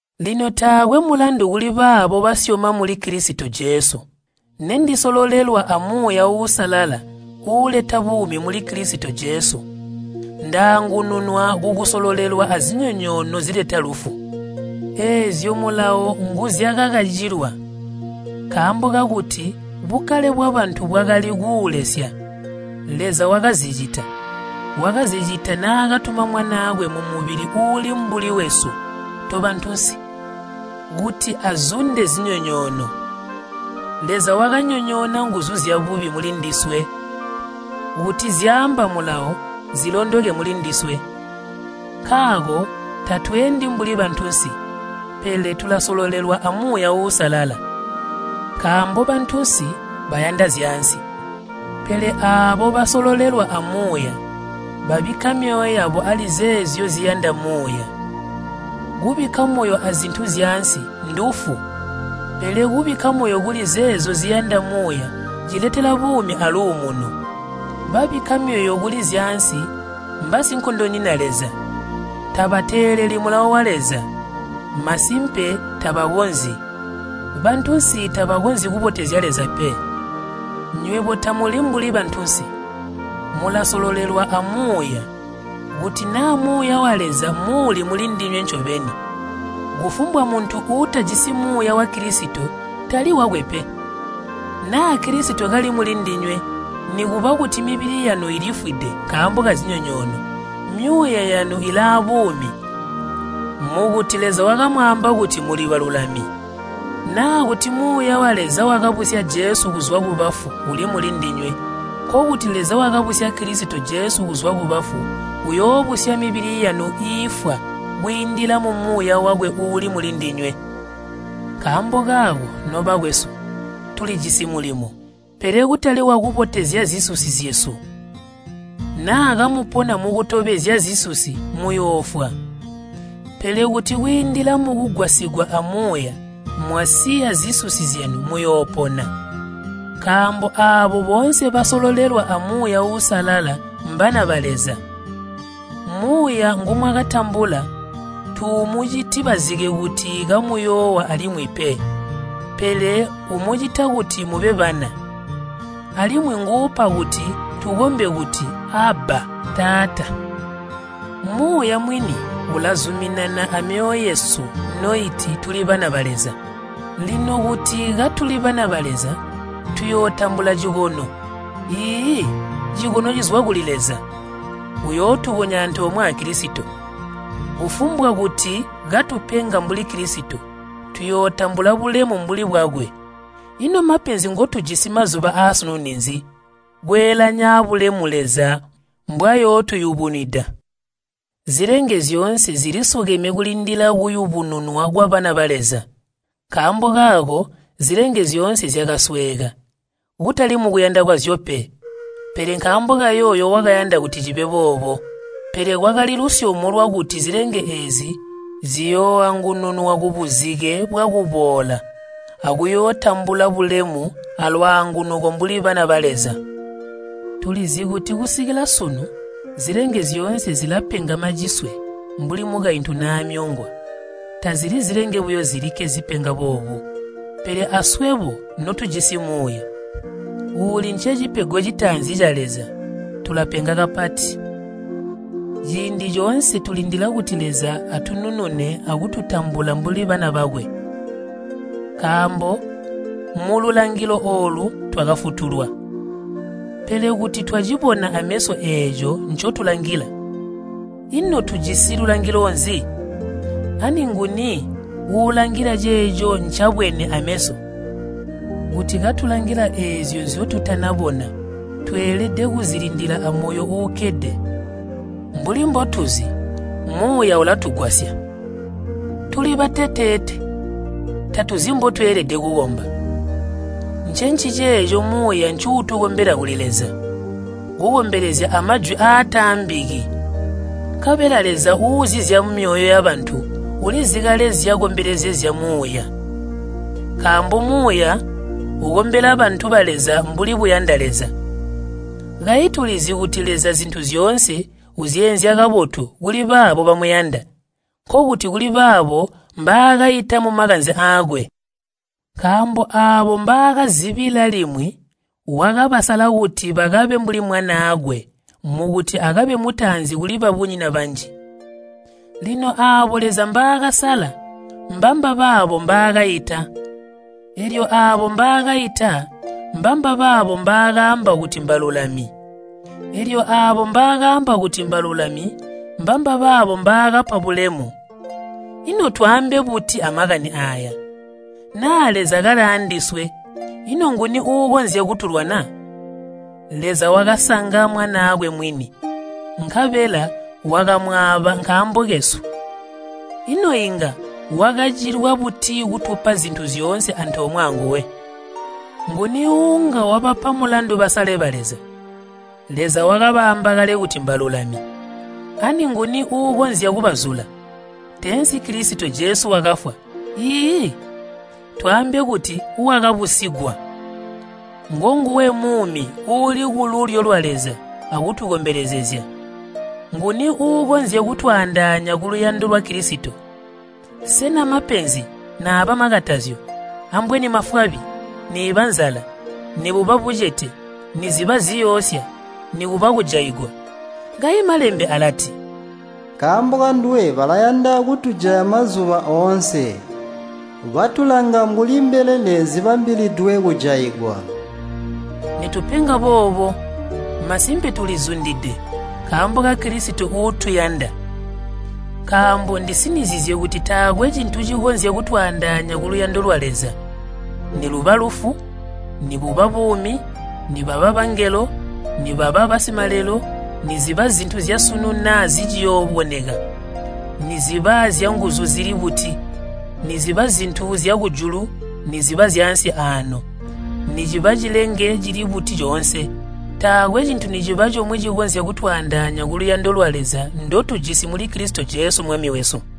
Lino taakwe mulandu kulibaabo basyoma muli Kilisito Jesu. Nendisololelwa a Muuya Uusalala uuleta buumi muli Kilisito Jesu, ndaangununwa kukusololelwa azinyonyoono zileta lufu. Eezyo Mulawo nguzyakakacilwa, nkaambo kakuti bukkale bwabantu bwakali kuulesya, Leza wakazicita, wakazicita naakatuma Mwanaakwe mumubili uuli mbuli wesu tobantunsi kuti azunde zinyonyoono. Leza wakanyonyoona nguzu zyabubi mulindiswe kuti zyaamba Mulawo zilondoke mulindiswe. Nkaako tatweendi mbuli bantunsi, pele tulasololelwa a Muuya Uusalala. Nkaambo bantunsi bayanda zyaansi, pele aabo basololelwa a Muuya babikka myoyo yabo ali zeezyo ziyanda Muuya. Kubikka moyo azintu zyaansi ndufu, pele kubikka moyo kuli zeezyo ziyanda Muuya ciletela buumi aluumuno. Babikka myoyo kuli zyaansi mbaasinkondonyina Leza. Tabateeleli Mulawo wa Leza, masimpe tabakonzyi. Bantunsi tabakonzyi kubotezya Leza pe. Nywebo tamuli mbuli bantunsi, mulasololelwa a Muuya, kuti naa Muuya wa Leza muuli mulindinywe ncobeni. Kufumbwa muntu uutajisi Muuya wa Kilisito, tali wakwe pe. Naa Kilisito kali mulindinywe, nikuba kuti mibili yanu ilifwide nkaambo kazinyonyoono, myuuya yanu ilaabuumi, mukuti Leza wakamwaamba kuti muli balulami. Naa kuti Muuya wa Leza wakabusya Jesu kuzwa kubafu uli mulindinywe, nkokuti Leza wakabusya Kilisito Jesu kuzwa kubafu uyoobusya mibili yanu iifwa kwiindila mu Muuya wakwe uuli mulindinywe. Nkaambo kaako, nobakwesu, tulijisi mulimo, pele kutali wakutobezya zisusi zyesu. Naa kamupona mukutobezya zisusi muyoofwa. Pele kuti kwiindila mukugwasigwa a Muuya mwasiya zisusi zyanu, muyoopona. Nkaambo aabo boonse basololelwa a Muuya Uusalala mbana ba Leza. Muuya ngumwakatambula tuumuciti bazike kuti kamuyoowa alimwi pe, pele umucita kuti mube bana. Alimwi nguupa kuti tukombe kuti, “Abba, Taata.” Muuya mwini ulazuminana amyoyo yesu noiti tuli bana ba Leza. Lino kuti katuli bana ba Leza, tuyootambula cikono, iiyi cikono cizwa kuli Leza, uyootukonya antoomwe a Kilisito. Kufumbwa kuti katupenga mbuli Kilisito, tuyootambula bulemu mbuli bwakwe. Ino mapenzi ngotujisi mazuba aasunu ninzi kweelanya abulemu Leza mbwayootuyubunwida! Zilenge zyoonse zilisukeme kulindila kuyubununwa kwabana ba Leza. Nkaambo kaako zilenge zyoonse zyakasweeka, kutali mukuyanda kwazyo pe, pele nkaambo kayooyo wakayanda kuti cibe boobo. Pele kwakali lusyomo lwakuti zilenge eezi ziyooangununwa kubuzike bwakubola akuyootambula bulemu alwaangunuko mbuli bana ba Leza. Tulizi kuti kusikila sunu zilenge zyoonse zilapenga maciswe mbuli mukaintu naamyongwa. Tazili zilenge buyo zilikke zipenga boobu, pele aswebo notujisi Muuya, uuli ncecipego citaanzi ca Leza, tulapenga kapati. Ciindi coonse tulindila kuti Leza atununune akututambula mbuli bana bakwe. Nkaambo mululangilo oolu twakafutulwa. Pele kuti twacibona aameso eeco ncotulangila, ino tujisi lulangilo nzi? Ani nguni uulangila ceeco ncabwene aameso? Kuti katulangila eezyo nzyotutanabona, tweelede kuzilindila amoyo uukkede. Mbuli mbotuzi, Muuya ulatugwasya. Tuli bateteete, tatuzi mbotweelede kukomba. Ncenciceeco Muuya ncuutukombela kuli Leza, kukombelezya amajwi aataambiki. Nkabela Leza uuzi zyamumyoyo yabantu ulizi kale nzyakombelezezya Muuya. Nkaambo Muuya ukombela bantu ba Leza mbuli buyanda Leza. Kayi tulizi kuti Leza zintu zyoonse uzyeenzya kabotu kulibaabo bamuyanda, nkokuti kulibaabo mbaakaita mumakanze aakwe. Nkaambo aabo mbaakazibila limwi wakabasala kuti bakabe mbuli Mwanaakwe mukuti akabe mutaanzi kuli babunyina banji. Lino aabo Leza mbaakasala mbambabaabo mbaakaita. Eelyo aabo mbaakaita mbambabaabo mbaakaamba kuti mbalulami. Eelyo aabo mbaakaamba kuti mbalulami mbambabaabo mbaakapa bulemu. Ino twaambe buti amakani aaya? Naa Leza kali aandiswe, ino nguni uukonzya kutulwana? Leza wakasanga Mwanaakwe mwini, nkabela wakamwaaba nkaambo kesu. Ino inga wakacilwa buti kutupa zintu zyoonse antoomwe anguwe? Nguni uunga wabapa mulandu basale ba Leza? Leza wakabaamba kale kuti mbalulami. Ani nguni uukonzya kubazula? Teensi Kilisito Jesu wakafwa, iiyi, twaambe kuti wakabusigwa. Ngonguwe muumi uuli kululyo lwa Leza akutukombelezezya. Nguni uukonzya kutwaandaanya kuluyando lwa Kilisito? Sena mapenzi naaba makatazyo, ambweni mafwabi, niiba nzala, nibuba bucete, niziba ziyoosya, nikuba kujaigwa? Kayi Malembe alati, “Nkaambo kanduwe balayanda kutujaya mazuba oonse. Batulanga mbuli mbelele zibambilidwe kujaigwa.” Nitupenga boobo, masimpe tulizundide nkaambo ka Kilisito uutuyanda. Nkaambo ndisinizizye kuti taakwe cintu cikonzya kutwaandaanya kuluyando lwa Leza. Niluba lufu, nibuba buumi, nibaba bangelo, nibaba basimalelo, niziba zintu zyasunu naa ziciyooboneka, niziba zyanguzu zili buti, niziba zintu zyakujulu niziba zyaansi aano, niciba cilenge cili buti coonse, taakwe cintu niciba comwe cikonzya kutwaandaanya kuluyando lwa Leza ndotujisi muli Kilisito Jesu Mwami wesu.